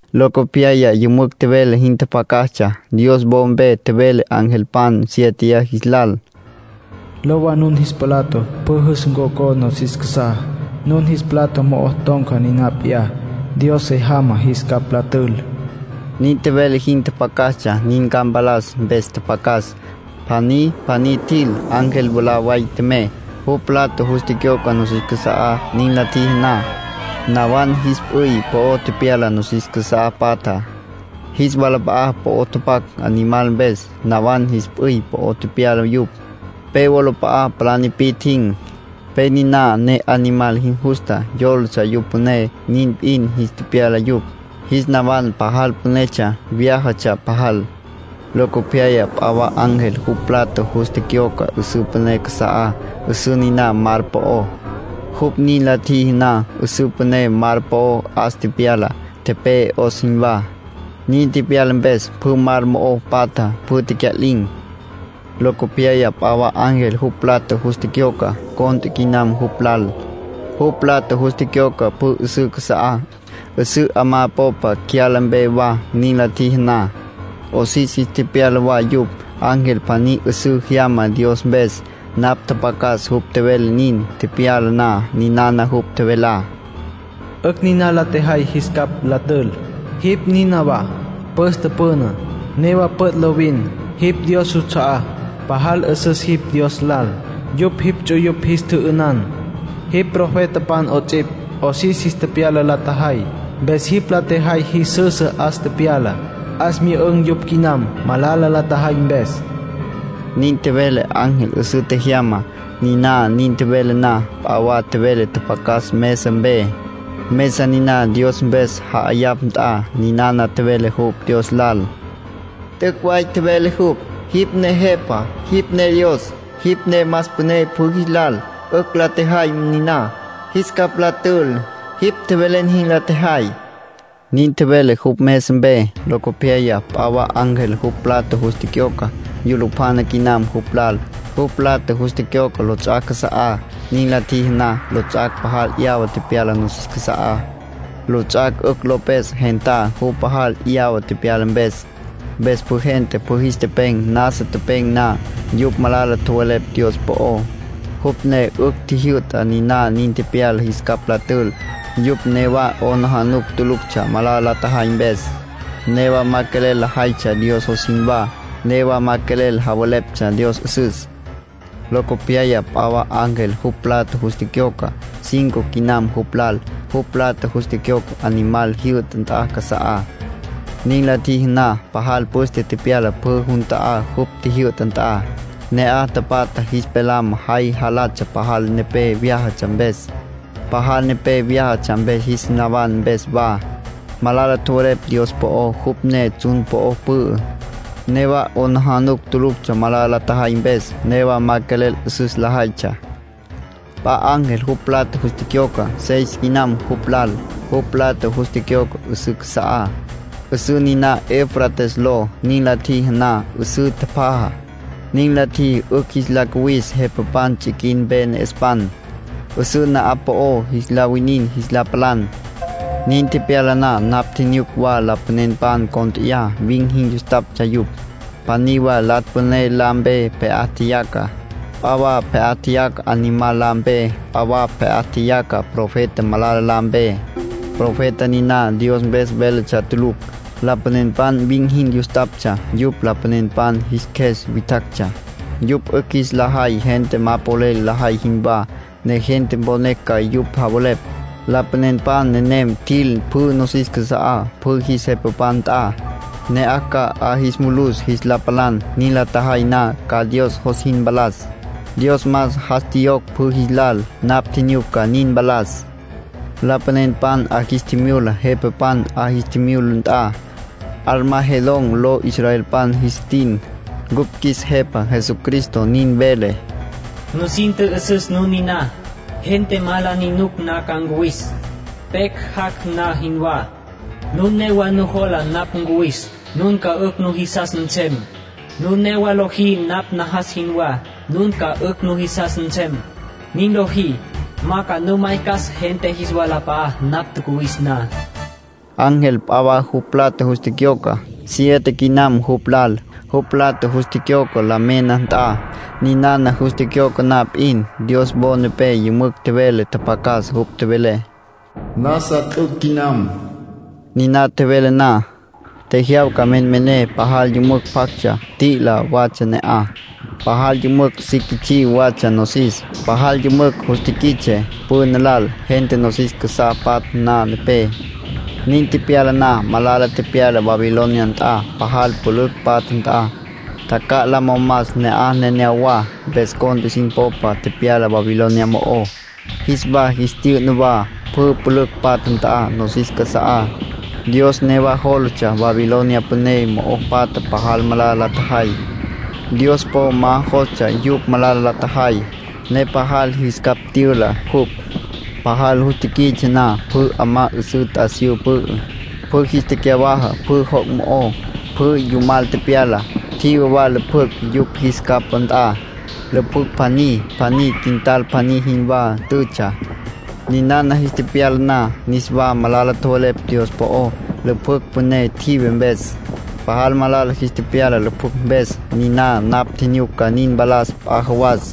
Locopyaya yümücj tjevele jin tjapjacastsja. Dios wo mpe tjevele angelpan siéteya jis lal: “Lowa, nun jis plato pjü yus tococa nosis casa'á; nun jis plato mo'o ton̈ca niná p'iyá Dios se jamá jis capj la tül”. Nin tjevele jin tjapjacastsja. Nin ca mpalas mpes tjapjacas. Pjaní pjaní tjil. Ángel mwalá way tjemey, jupj plato jus tecyoca nosis casa'á. Nin la tjiji na, nawan jis p'üy po'o tepyala nosis casá patjá. Jis wala po'o tapac Animal mpes, nawan jis p'üy po'o tepyala yupj. Pe wolap'a'a palá nipi'tjin̈, pe niná ne Animal jin justa, yólatsja jupj püné, nin p'in jis tepyala yupj. Jis nawan pajal pünetsja, vyájatsja pajal. Locopyaya p'a wa ángel jupj plato jus tecyoca 'üsǘ püné casa'á, 'üsǘ niná mar po'ó. Jupj nin la tjiji na, 'üsǘ püné mar po'ó 'as tepyala, tepe'e 'os jinwá. Nin tepyala mpes, pjü mar mo'o patja, pjü tecya'lin̈. Locopyaya p'a wa ángel jupj plato jus tecyoca. Cont'e quinam jupj lal. Jupj plato jus tecyoca pjü 'üsǘ casa'á, 'üsǘ 'amá popa cyala mpe wa. Nin la tjiji na, 'osis jis tepyala wa yupj. Ángel pjaní 'üsǘ jyama Dios mpes. Napj tjapjacas jupj tjevele nin tepyala na. Ninana jupj tjevelá: “'Ücj niná la tjejay jis capj la tül. Jipj nínawa pütsja püná, newa püt' lovin. Jipj Dios juts'a'á, pajal 'üsüs jipj Dios lal. Yupj jipj ts'uyupj jis tjü'ünan, jipj profetapan 'ots'ipj. 'Osis jis tepyala la tjajay. Mpes jipj la tjejay jis süsü 'as tepyala. 'As myü'ün̈ yupj quinam, malala la tjajay mpes”, nin tjevele ángel 'üsǘ tjejyamá. Niná nin tjevele na, p'a wa tjevele tjapjacas mesa mpe, mesa niná Dios mpes ja'ayapj nt'a. Ninana tjevele jupj Dios lal: “T'üc' way tjevele jupj. Jipj ne Jepa. Jipj ne Dios. Jipj ne más püné pjü jis lal. 'Ücj la tjejay niná, jis capj la tül. Jipj tjevelen jin la tjejay”, nin tjevele jupj mesa mpe. Locopyaya p'a wa ángel jupj plato jus tecyoca. Yulupjana quinam jupj lal. Jupj plato jus tecyoca lots'ac' casa'á. Nin la tjiji na, lots'ac' pajal 'yawa tepyala nosis casa'á, lots'ac' 'ücj lo pes gentá, jupj pajal 'yawa tepyala mpes. Mpes pjü gente pjü jis tepen̈. Nasa tepen̈ na, yupj malala tjowelepj Dios po'ó, jupj ne 'ücj tjijyü'ta niná nin tepyala jis capj la tül. Yupj newa 'aplijila tuluctsja malala la tjajay mpes. Newa ma quelel lajaytsja Dios jos jinwá. Newa ma quelel javeleptsja Dios 'üsüs. Locopyaya p'a wa ángel jupj plato jus tecyoca. Cinco quinam jupj lal. Jupj plato jus tecyoca Animal jyü'ta nt'a casa'á. Nin la tjiji na, pajal püste tepyala pjü jun ta'á jupj tjijyü'ta nt'a. Ne'aj tapatjá jis pelam jay jalatsja pajal nepé vyájatsja mpes. Pajal nepé vyájatsja mpes, jis nawan mpes wa, malala tjowelepj Dios po'ó, jupj ne tsjun po'o pü'ü. Newa 'aplijila tuluctsja malala la tjajay mpes. Newa ma quelel 'üsüs lajaytsja. P'a ángel jupj plato jus tecyoca. Seis quinam jupj lal. Jupj plato jus tecyoca 'üsǘ casa'á, 'üsǘ niná Eufrates ló. Nin la tjiji na, 'üsǘ tjapjaja. Nin la tjiji 'ücj jis la cuwis jepapan tsiquin mpe ne'espan, 'üsǘ na'aj po'o jis la winin jis la palan. Nin tepyala na, napj tjinyuc wa lapanenpan cont'eyá. Vin̈ jin yustaptsja yupj. Pjaní wa Latsj Püné la mpe pje'á tjeyaca. P'a wa pje'á tjeyaca Animal la mpe. P'a wa pje'á tjeyaca Profeta Malala la mpe. Profeta niná Dios mpes véletsja tulucj. Lapanenpan vin̈ jin yustaptsja, yupj lapanenpan jis qjues witjactsja. Yupj 'ücj jis la jay gente ma polel lajay jinwá, ne gente mponecj ca yupj javelepj. Lapanenpan nenem tjil pjü nosis casa'á, pjü jis jepapan nt'a, ne'aj ca 'a jis mulus jis la palan. Nin la tjajay na, ca Dios jos jin mpalas. Dios más jas tjiyocj pjü jis lal. Napj tjinyuc ca nin mpalas. Lapanenpan 'a jis tjimyula jepapan. 'A jis tjimyula nt'a, Armagedón ló israelpan jis tin. Ncupj qjuis Jepa Jesucristo nin vele: “Nusin tjü'üsüs nun niná. Gente ma la ni nuc na ca ncuwis, pecj jac' na jinwá. Nun newa nujola napj ncuwis, nun ca 'ücj nujisas nsem. Nun newa lojí napj najas jinwá, nun ca 'ücj nujisas nsem. Nin lojí, ma ca nu maycas gente jis walap'a'á napj tjacuwis na.” Nin tjevele jupj. Ángel p'a wa jupj plato jus tecyoca. Siete quinam jupj lal. Jupj plato jus tecyoca la mena nt'a. Ninana jus tecyoca na p'in, Dios wo nepé yümücj tjevele tjapjacas. Jupj tjevele: “Nasa t'üc' quinam”. Niná tjevele na, tjejyawca menmené, pajal yümücj pjactsja, t'i'ila watsja ne'aj. Pajal yümücj si quits'í watsja nosis. Pajal yümücj jus tiquits'e püná lal, gente nosis casá patja na mpe. Nin tepyala na, malala tepyala Babilonia nt'a, pajal pülücj patja nt'a. Tjacja'la momas ne'aj neneyawá, mpes cont'e sin popa tepyala Babilonia mo'ó. Jis wa jis tyü'na wa, pjü pülücj patja nt'a, nosis casa'á. Dios newa jólatsja “Babilonia Püné” mo'o patja pajal malala la tjajay. Dios po ma jostsja yupj malala la tjajay, ne pajal jis capj tyüla jupj. Pajal jus tiquits'e na, pjü 'amá 'üsǘ t'asiyú pü'ü, pjü jis tecyawaja. Pjü joc' mo'ó, pjü yumal tepyala. Tjive wa lüpjücj yupj jis capá nt'a. Lüpjücj pjaní pjaní quintal pjaní jinwá tütsja. Ninana jis tepyala na, niswa malala tjowelepj Dios po'ó, lüpjücj püné tjive mpes. Pajal malala jis tepyala lüpjücj mpes. Niná napj tjinyuc ca nin mpalas p'a jawas.